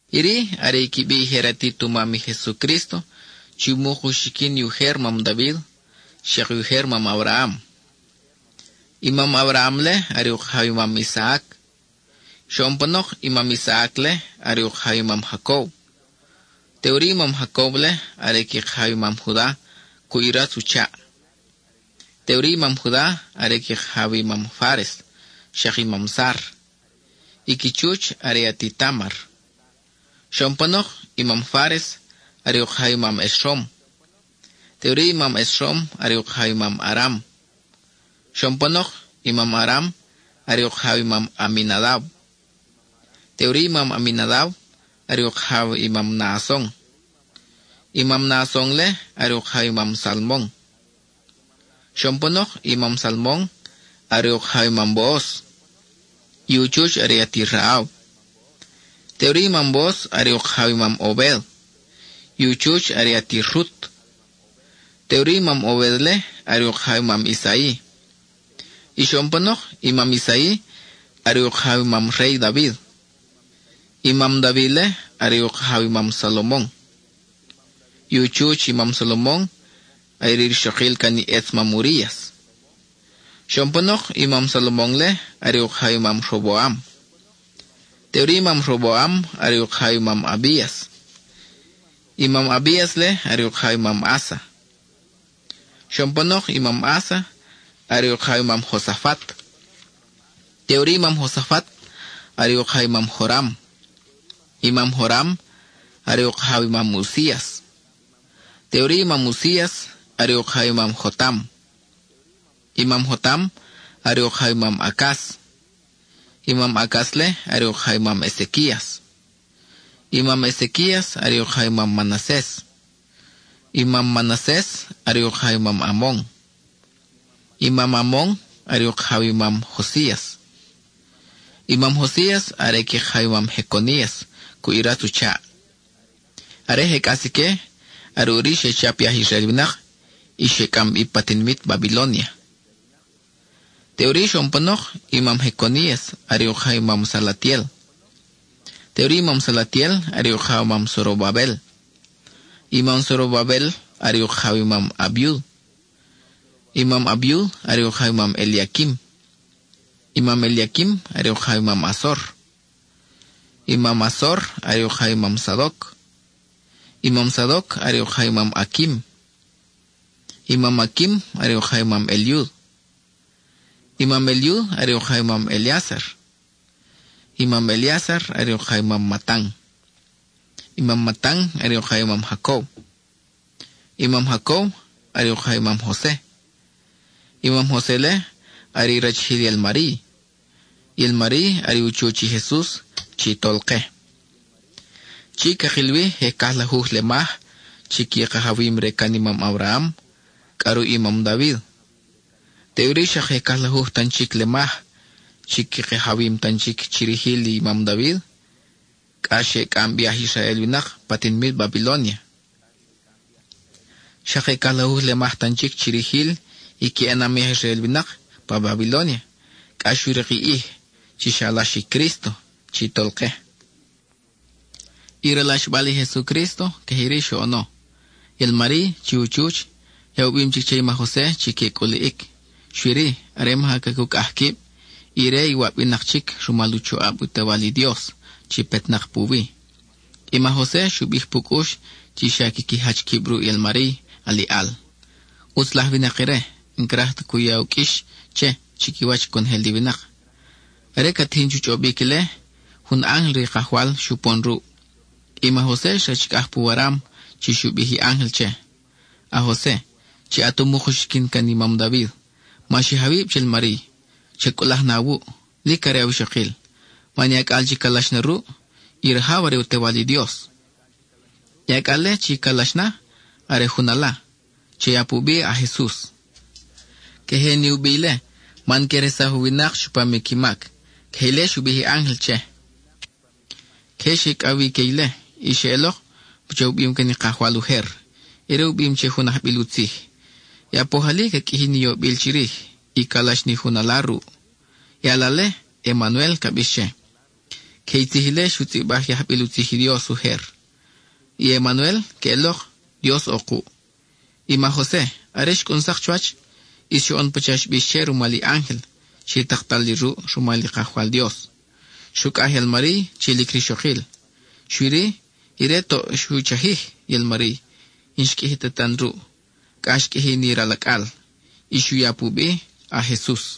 Iri are i qui bi i je ratit u mam i Jesucrísto chi umuk uxiquin i ujer mam David xak i ujer mam Abraham. I mam Abraham-le are u kajaw i mam Isaac; xoʼon panok, i mam Isaac-le are u kajaw i mam Jacob; teʼuri i mam Jacob-le are i qui kajaw i mam Juda cuʼ i ratz u chaʼ. Teʼuri i mam Juda are qui kajaw i mam Fáres xak i mam Zar, i qui chuch are i ati Támar. Xoʼon panok, i mam Fáres are u kajaw i mam Esrom, teʼuri i mam Esrom are u kajaw i mam Aram. Xoʼon panok, i mam Aram are u kajaw i mam Aminadab; y teʼuri i mam Aminadab are u kajaw i mam Naason; i mam Naason-le are u kajaw i mam Salmon. Xoʼon panok, i mam Salmon are u kajaw i mam Booz, y u chuch are i ati Rahab. Teʼuri i mam Booz are u kajaw i mam Obed, y u chuch are i ati Rut. Teʼuri i mam Obed-le are u kajaw i mam Isai. Y xoʼon panok, i mam Isai are u kajaw i mam Rey David. I mam David-le are u kajaw i mam Salomon, i u chuch i mam Salomon are i rixokil can i ʼetz mam Urías. Xoʼon panok, i mam Salomon-le are u kajaw i mam Roboam; teʼuri i mam Roboam are u kajaw i mam Abías; i mam Abías-le are u kajaw i mam Asa. Xoʼon panok, i mam Asa are u kajaw i mam Josafat, teʼuri i mam Josafat are u kajaw i mam Joram; i mam Joram are u kajaw i mam Uzías. Teʼuri i mam Uzías are u kajaw i mam Jotam; i mam Jotam are u kajaw i mam Acaz; i mam Acaz-le are u kajaw i mam Ezequías. I mam Ezequías are u kajaw i mam Manases, i mam Manases are u kajaw i mam Amon; i mam Amon are u kajaw i mam Josías. I mam Josías are qui kajaw i mam Jeconías cuʼ i ratz u chaʼ. Are je cʼas ique, are ʼuri xe chap i aj Israel winak y xe cʼam bi pa tinimit Babilónia. Teʼuri, xoʼon panok i mam Jeconías are u kajaw i mam Salatiel; teʼuri i mam Salatiel are u kajaw i mam Zorobabel. I mam Zorobabel are u kajaw i mam Abiud; i mam Abiud are u kajaw i mam Eliaquim; i mam Eliaquim are u kajaw i mam Azor; i mam Azor are u kajaw i mam Sadoc; i mam Sadoc are u kajaw i mam Aquim; i mam Aquim are u kajaw i mam Eliud. I mam Eliud are u kajaw i mam Eleázar; i mam Eleázar are u kajaw i mam Matan; i mam Matan are u kajaw i mam Jacob. I mam Jacob are u kajaw i mam Jose; i mam Jose-le are i rachijil i al-Mariy. I al-Mariy are u chuch i Jesus chi Tolke. Chi cakil wi je cajlajuj lemaj chi qui kajawim re can i mam Abraham cʼa ruʼ i mam David; teʼuri xak je cajlajuj tan chic lemaj chi qui kajawim tan chic chi rijil i mam David cʼa xe cʼam bi i aj Israel winak pa tinimit Babilónia. Xak je cajlajuj lemaj tan chic chi rijil i qui ʼenam i aj Israel winak pa Babilónia cʼa xu rik i ʼij chi xalax i Crísto chi Tolke. I ralaxbal i Jesucrísto, queje iri xoʼono: i al-Mariy, chi u chuch, ya u bim chic che i ma Jose chi que cʼuliʼic. Xui-ri, are maja cacucʼaj quib, ire iwab winak chic rumal u choʼab u Tewal i Dios chi petnak puwi. I ma Jose xu bij pu cʼux chi xa quiqui jach quib ruʼ i al-Mariy aliʼal. ʼUtz laj winak ire, n-craj ta cu ya u qʼuix che chiquiwach conojel i winak. Are ca tijin chu chʼobic ile, jun ángel re i Kajwal xupon ruʼ. I ma Jose xrachicʼaj pu waram chi xu bij i ángel che: —A-Jose, chi at umuk uxiquin can i mam David, ma xij awib che i al-Mariy; cha cʼulaj na awuʼ, lic are awixokil, man i acʼal chi calax na ruʼ, i rajaw are i u Tewal i Dios. I acʼal-le chi calax na, are jun ala. Cha ya pu bi A-JESUS. Queje ni u bi ile, man que resaj u winak chupam i qui mac. (Queje ile xu bij i ángel che.) Queje xe icʼaw wi ique ile; y xeʼelok pacha u bim can i Kajwal ujer. Ire u bim che jun ajbil u tzij: I apoj ali ca qʼuiji ni yobil chirij y calax ni jun ala ruʼ; i ala-le, Emanuel ca bix che. Queje i tzij ile xu tzʼibaj i ajbil u tzij i Dios ujer. I “Emanuel” queʼelok: Dios ʼo kuʼ. I ma Jose, are xcʼun sak chuwach, ʼis xoʼon pacha xbix che rumal i ángel chi taktal li ruʼ rumal i Kajwal Dios; xrucʼaj i al-Mariy chi lic rixokil. Xui-ri, ire toʼ xu chajij i al-Mariy, n-xqʼuiji ta tan ruʼ, cʼa xqʼuiji ni ral acʼal; y xu ya pu bi A-JESUS.